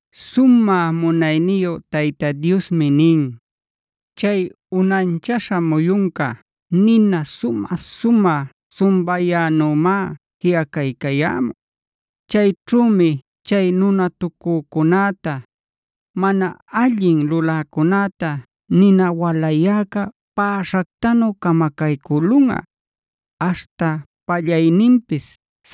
Sumä munayniyu Tayta Diosmi nin: “Chay unanchaśha muyunca nina sumä-sumä sumbayänümá jiꞌacaycayämun. Chayćhümi chay nunatucücunäta, mana allin luläcunäta nina walayäca päśhactanu camacaycülunꞌa; aśhta pallayninpis,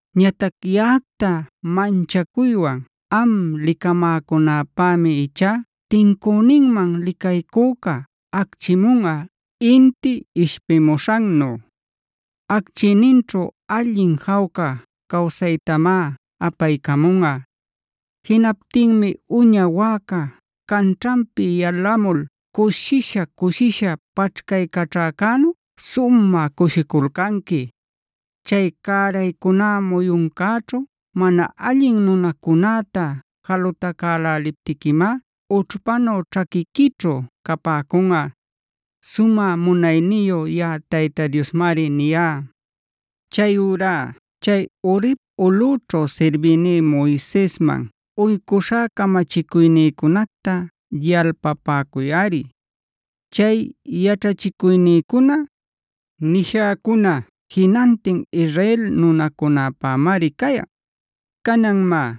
“Ñatac yaꞌacta manchacuywan am licamäcunäpämi ichá tincüninman licaycüca acchimunꞌa inti ishpimuśhannu; acchiyninćhu allin jawca cawsaytamá apaycamunꞌa.b Jinaptinmi uña wäca canćhanpi yalämul cushisha-cushisha paćhcaycaćhäcänu sumä cushiculcanqui. Chay cäraycuná muyuncäćhu mana allin nunacunäta jalutacäläliptiquimá ućhpanu ćhaquiquićhu capäcunꞌa. Sumä munayniyu yaꞌa Tayta Diosmari niyá. “Chayurá chay Horebc ulꞌućhu sirbïní Moisesman uycuśhá camachicuynïcunacta yalpapäcuyꞌari. Chay yaćhachicuynïcuna, nishäcuna jinantin Israel nunäcunapämari cayan. “Canan má,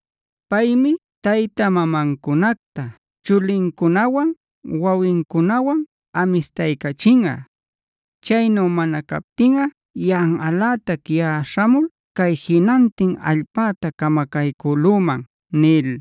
Paymi tayta-mamancunacta chulincunawan wawincunawan amistaycachinꞌa.e Chaynu mana captinꞌa yanꞌalätac yaꞌa śhamul cay jinantin allpäta camacaycülüman” nil.